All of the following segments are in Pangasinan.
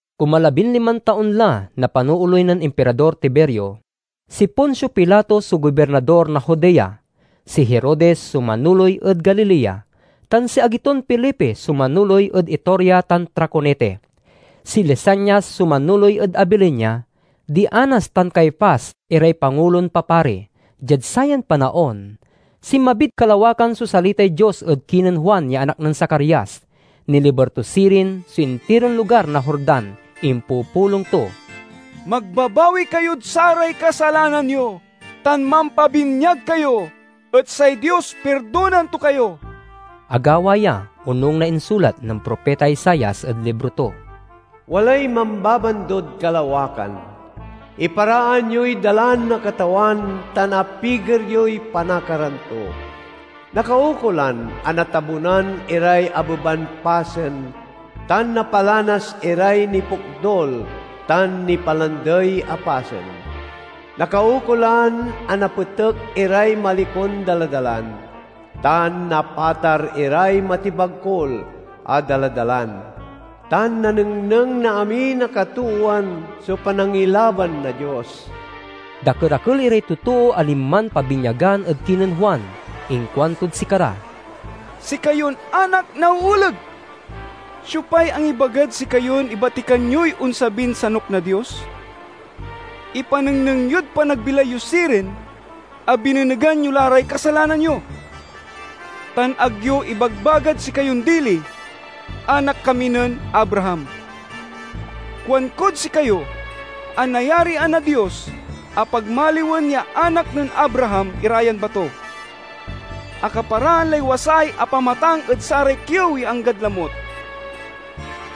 Kumalabinliman taon la na panooley nen Impirador Tiberio. Si Poncio Pilato so gobirnador na Judea, si Herodes so manoley ed Galilea, tan si agi ton Felipe so manoley ed Iturea tan Traconite. Si Lisanias so manoley ed Abilinia. Di Anas tan Caifas iray pangulon papari. Diad sayan panaon, sinmabid kalawakan so salitay Dios ed kinen Juan ya anak nen Zacarias. Niliber to sirin so intiron lugar na Jordan. Impupulong to, "Magbabawi kayod saray kasalanan yo tan mampabinyag kayo, et say Dios pirdonaen to kayo." Agawa ya onung na insulat nen propita Isaias ed libro to: "Walay mambabandod kalawakan, 'Iparaan yoy dalan na Katawan tan apiger yoy panakaran to! Nakaukolan a natabunan iray abeban pasen tan napalanas iray nipokdul tan nipalandey a pasen. Nakaukolan a napetek iray malikon daladalan, tan napatar iray matibagkul a daladalan, Tan nanengneng na amin a katoowan so panangilaban na Dios!'" Dakerakel iray totoo a linman pabinyagan ed kinen Juan. Inkuantod sikara, "Sikayon anak na ooleg! Siopay angibagad sikayon ibatikan yoy onsabin sanuk na Dios? Ipanengneng yod panagbilay yo sirin a binenegan yo la ray kasalanan yo. Tan ag yo ibagbagad sikayon dili, 'Anak kami nen Abraham.' Kuankod sikayo a nayarian na Dios a pagmaliwen ya anak nen Abraham ira yan bato. Akaparaan lay wasay a pamatang ed saray kiew ya anggad lamut.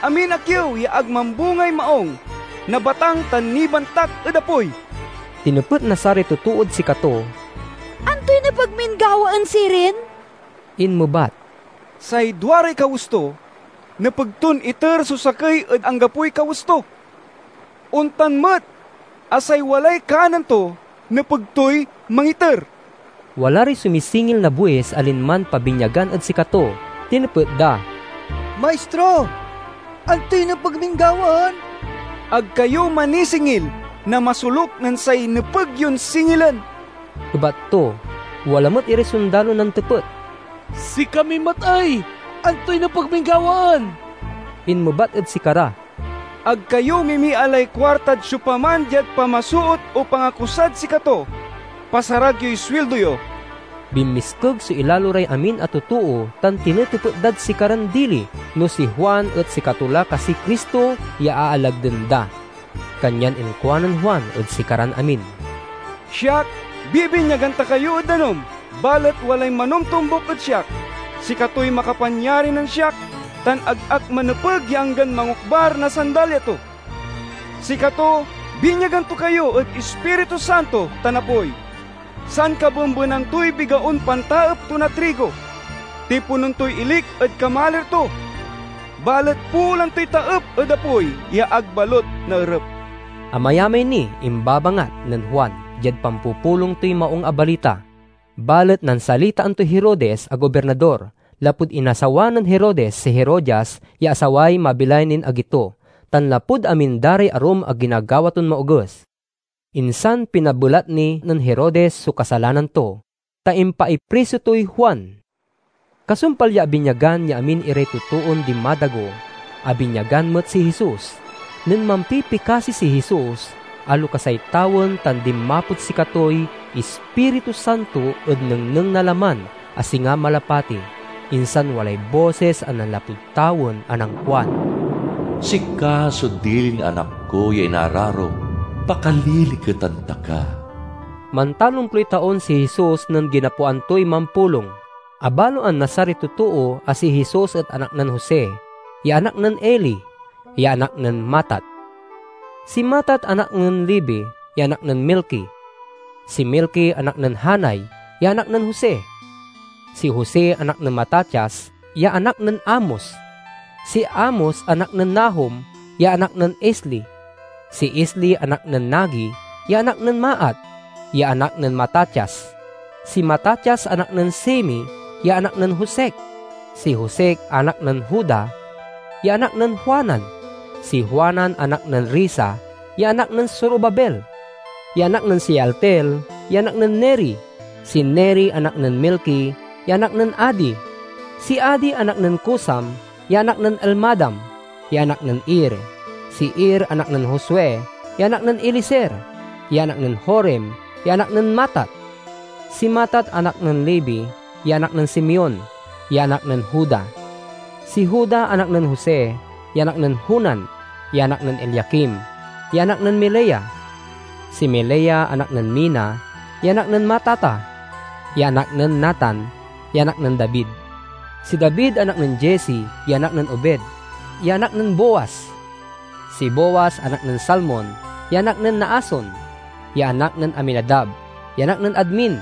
Amin a kiew ya ag mambungay maung nabatang tan nibantak ed apoy." Tinepet na saray totood sikato, "Antoy nepeg min gawaen sirin?" Inmebat, "Say duaray kawes to nepeg ton iter so sakey ed anggapoy kawes to. Ontan met a say walay kanen to nepeg toy mangiter." Wala ray sumisingil na buis a linman pabinyagan ed sikato. Tinepet da, "Maistro, antoy nepeg min gawaen?" "Ag kayo manisingil na masoluk nen say nepeg yon singilen," ebat to. Wala met iray sondalon nantepet, "Sikami met ey? Antoy nepeg min gawaen?" Inmebat ed sikara, "Ag kayo mimialay kuartad siopaman diad pamasoot o pangakusad sikato. Pasarag yoy suildo yo." Binmiskeg so ilalo ray amin a totoo tan tinetepet dad sikaran dili no si Juan et sikato la kasiy Cristo ya aalagden da. Kanyan inkuanen Juan ed sikaran amin, "Siak bibinyagan ta kayo ed danum, balet walay manomtombuk ed siak. Sikatoy makapanyari nen siak tan ag ak manepeg ya anggan mangokbar na sandalya to. Sikato binyagan to kayo ed Ispiritu Santo tan apoy. Sankabembenan toy bigaon pantaep to na trigo. Tiponen toy ilik ed kamalir to, balet poolan toy taep ed apoy ya ag balut naerep." Amayamay niy imbabangat nen Juan diad pampupulong toy Maung a Balita. Balet nansalitaan toy Herodes a gobirnador, lapud inasawa nen Herodes si Herodias ya asaway mabilay nin agi to, tan lapud amin da ray arum a ginagawa ton maoges. Insan pinabelat ni nen Herodes so kasalanan to, ta impaipriso toy Juan. Kasumpal ya abinyagan ya amin iray totoon dinmadago, abinyagan met si Jesus. Nen mampipikasi si Jesus, alokasay tawen tan dinmapod sikatoy Ispiritu Santo ed nengneng na laman a singa malapati. Insan walay bosis a nanlapud tawen a nankuan, "Sika so dilin Anak ko ya inararok; pakaliliketan ta ka." Mantalomploy taon si Jesus nen ginapoan toy mampulong. Abaloan na saray totoo a si Jesus et anak nen Jose, ya anak nen Eli, ya anak nen Matat. Si Matat anak nen Levi, ya anak nen Melki. Si Melki anak nen Janai, ya anak nen Jose. Si Jose anak nen Matatias, ya anak nen Amos. Si Amos anak nen Nahum, ya anak nen Esli. Si Esli anak nen Nage, ya anak nen Maat, ya anak nen Matatias. Si Matatias anak nen Semei, ya anak nen Josek. Si Josek anak nen Joda, ya anak nen Joanan. Si Joanan anak nen Resa, ya anak nen Zorobabel, ya anak nen Sealtiel, ya anak nen Neri. Si Neri anak nen Melki, ya anak nen Adi. Si Adi anak nen Cosam, ya anak nen Elmadam, ya anak nen Er. Si Er anak nen Josue, ya anak nen Eliezer, ya anak nen Jorim, ya anak nen Matat. Si Matat anak nen Levi, ya anak nen Simeon, ya anak nen Juda. Si Juda anak nen Jose, ya anak nen Jonan, ya anak nen Eliakim, ya anak nen Melea. Si Melea anak nen Mena, ya anak nen Matata, ya anak nen Natan, ya anak nen David. Si David anak nen Jesse, ya anak nen Obed, ya anak nen Booz. Si Booz anak nen Salmon, ya anak nen Naason, ya anak nen Aminadab, ya anak nen Admin.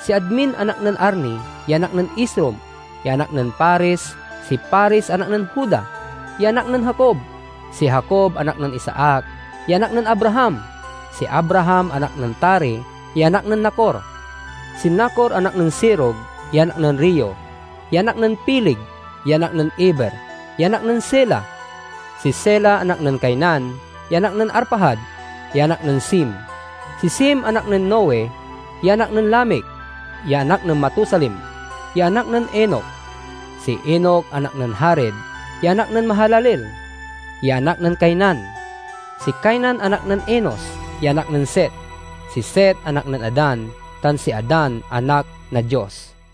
Si Admin anak nen Arni, ya anak nen Esrom, ya anak nen Fares. Si Fares anak nen Juda, ya anak nen Jacob. Si Jacob anak nen Isaac, ya anak nen Abraham. Si Abraham anak nen Tare, ya anak nen Nacor. Si Nacor anak nen Serug, ya anak nen Reu, ya anak nen Peleg, ya anak nen Eber, ya anak nen Sela. Si Sela anak nen Cainan, ya anak nen Arfajad, ya anak nen Sem. Si Sem anak nen Noe, ya anak nen Lamec, ya anak nen Matusalem, ya anak nen Enoc. Si Enoc anak nen Jared, ya anak nen Mahalaleel, ya anak nen Cainan. Si Cainan anak nen Enos, ya anak nen Set. Si Set anak nen Adan, tan si Adan anak na Dios.